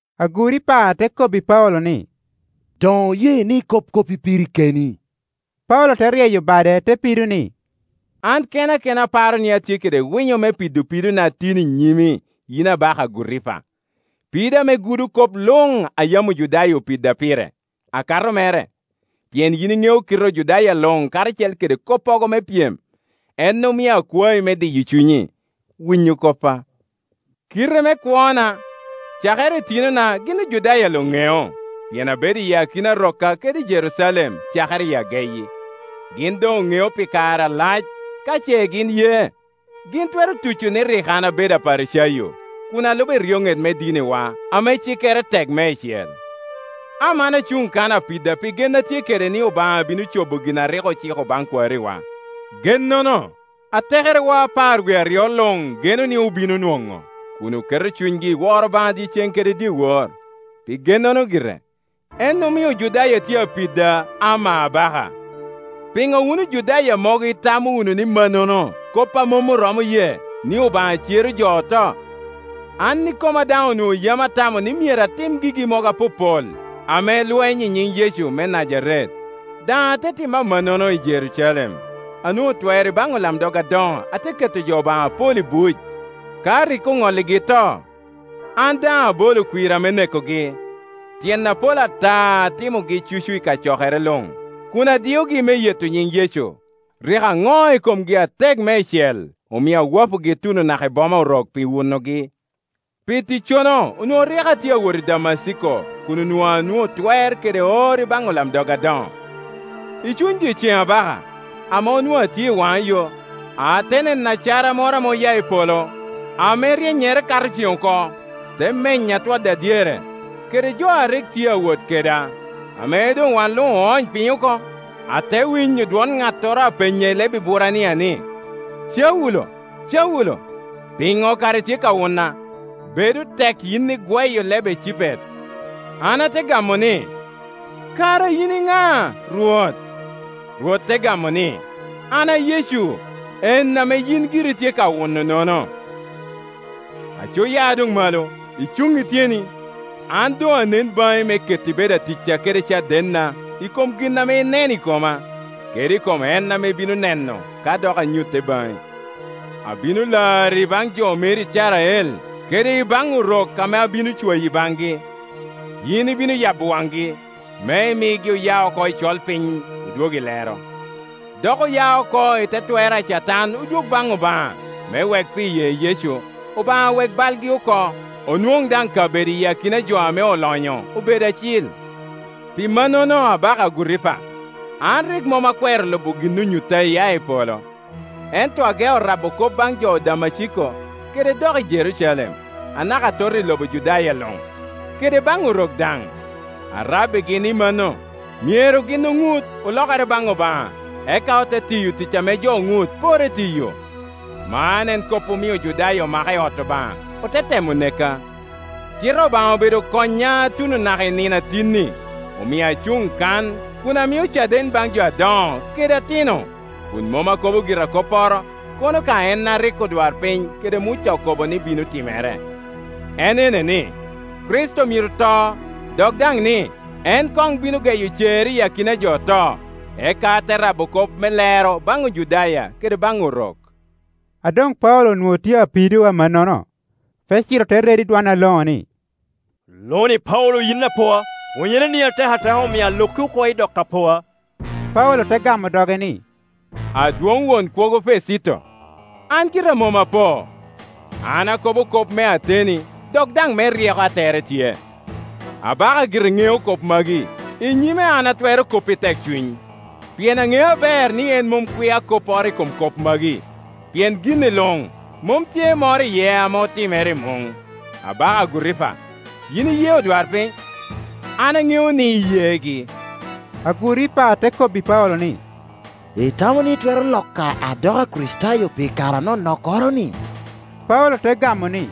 Aguripa te kobbi Paulo ni, “Doŋ oye ni ikob koppi piri keni.” Paulo te ryeyo bade te pido ni, “An kena kena aparo ni atye kede winyo me pido pidona tin i nyimi yin abaka Aguripa, pido ame gudo kop luŋ a yam Ojudaya opida pire, akato mere, pien yin iŋeo kite Ojudaya luŋ karacel kede koppogo me pyem. En omio akwayi me diyo cunyi, winyo koppa. “Kite me kwona, cakere i tinona gin Ojudaya luŋ ŋeo, pien abedo iyi akina rokka kede i Jerucalem cakere i ageyi. Gin doŋ oŋeo pi kare alac, ka ce gin ye, gin twero tuco ni rik an abedo Aparicayo, kun alubo eryoŋet me diniwa ame cikkere tek meicel. Aman acuŋ kan apida pi gen atye kede ni Obaŋa bino cobo gin a rik ociko baŋ kwariwa. Gennono, atekerewa apar wie aryo luŋ geno ni obino nwoŋo, kun oketo cunygi i woro Obaŋa dyeceŋ kede dyewor. Pi gennono gire, en omio Ojudaya tye apida, ama abaka! Piŋo wun Ojudaya mogo itamo wunu ni mannono kop a mom oromo ye, ni Obaŋa cero jo oto? “An ikoma daŋ onwoŋo yam atamo ni myero atim gigi mogo apopol ame lweny i nyiŋ Yecu me Najaret. Daŋ ate timo amannono i Jerucalem; anwo Ŋo twer i baŋ olamdog adoŋo ate ke to jo Obaŋa apol i buc. Ka rik oŋolligi to, an daŋ abolo kwirra me nekogi. Tyen apol ata atimogi cucu i kacokere luŋ, kun adiyogi me yeto nyin Yecu. Rik aŋo i komgi atek meicel, omio awapogi tuno naka i boma Orok pi wunogi. “Pi ticcono onwoŋo rik atye awot Damaciko kun onwoŋo anwoŋo twer kede or i baŋ olamdog adoŋo. I cuny dyeceŋ, abaka, ame onwoŋo atye i waŋa yo, ate neno acara moro ame oya i polo, ame ryennyere kato cen oko, te menya twoda dyere, kede jo a rik tye awot keda. Ame doŋ wan luŋ oony piny oko, ate winyo dwon ŋattoro a penya i leb Eburania ni, Taulo, Caulo, piŋo kara itye ka wuna? Bedo tek yin igweyo leb ecipet. An ate gamo ni, ‘Kara yin iŋa, Rwot!’ Rwot te gamo ni, ‘An a Yecu, en ame yin giri itye ka wuno-nono. Aco ya doŋ malo, icuŋ i tyeni, An doŋ anen baŋi me keti bedo aticca kede cadenna i kom gin ame ineno i koma, kede i kom en ame ibino neno ka dok anyutte baŋi. Abino lari i baŋ jo meri Icrael kede i baŋ Orok ame abino cwayi baŋgi. Yin ibino yabo waŋgi, me imigi oya oko i colpiny odwog i lero, dok oya oko i te twer a Catan odwog baŋ Obaŋa, me wek pi ye Yecu, Obaŋa wek balgi oko, onwoŋ daŋ kabedo i akina jo ame olonyo obedo acil.’ “Pi mannono, abaka Aguripa, an rik mom akwero lubo gin onyutta iya i polo, ento ageo rabo kop baŋ jo i Damaciko, kede doki i Jerucalem, anaka atot i lobo Judaya luŋ, kede baŋ Orok daŋ. Arabbigi ni mano, myero gin oŋut, olokere baŋ Obaŋa, eka ote tiyo tic ame jo oŋut porre tiyo. Man en kop omio Ojudaya omaka i ot Obaŋa, ote temo neka. Cite Obaŋa obedo konya tuno naka i nino a tin-ni, omio acuŋ kan kun amio caden baŋ jo adoŋo kede atino, kun mom akobo gira kopporo, kono ka en a rik odwarpiny kede Muca okobo ni bino timere; Kor. 15.20en ene ni, Kricito myero to, dok daŋ ni, en koŋ bino geyo cer iyi akina a jo oto, eka te rabo kop me lero baŋ Ojudaya kede baŋ Orok.” A doŋ Paulo onwoŋo tye apido amannono, Fesito te redo i dwon aloŋo ni, “Lo-ni Paulo yin apoa. Pwonyereni atek ateka omio aloki oko idoko apoa.” Paulo te gamo doge ni, “Adwoŋ won kwogo Fesito, an gira mom apo. An akobo kop me ateni dok daŋ me ryeko a tere tye. Abaka gire ŋeo kop magi; i nyime an atwero kop i tekcuny, pien aŋeo aber ni en mom kwia kopporo i kom kop magi, pien gin-ni luŋmom tye moro iye ame otimere i muŋ. Abaka Aguripa, yin iye odwarpiny? An aŋeo ni iyegi.” Aguripa te kobbi Paulo ni, “Itamo ni itwero loka adoko Akricitayo pi kare anonokkoro-ni?” Paulo te gamo ni,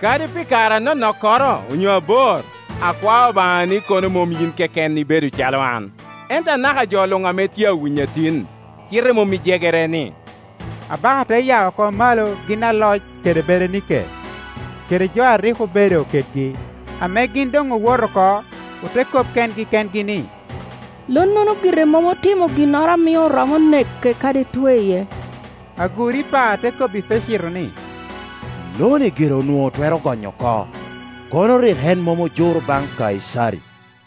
“Kadi pi kare anonokkoro onyo abor, akwao Obaŋa ni kono mom yin keken ibedo calo an, ento anaka jo luŋ ame tye awinya tin, cite mom i jegere-ni.” Abaka te ya oko malo gin i aloc kede Berenike, kede jo a rik obedo kedgi. Ame gin doŋ owoto oko ote kop kengi kengi ni, “Lonnono gire mom otimo ginnoro a mio oromo neke kadi tweye.” Aguripa te kobbi Fesito ni, “Lo-ni gire onwoŋo otwero gonyo oko, kono rik en mom ojuro baŋ Kaicari.”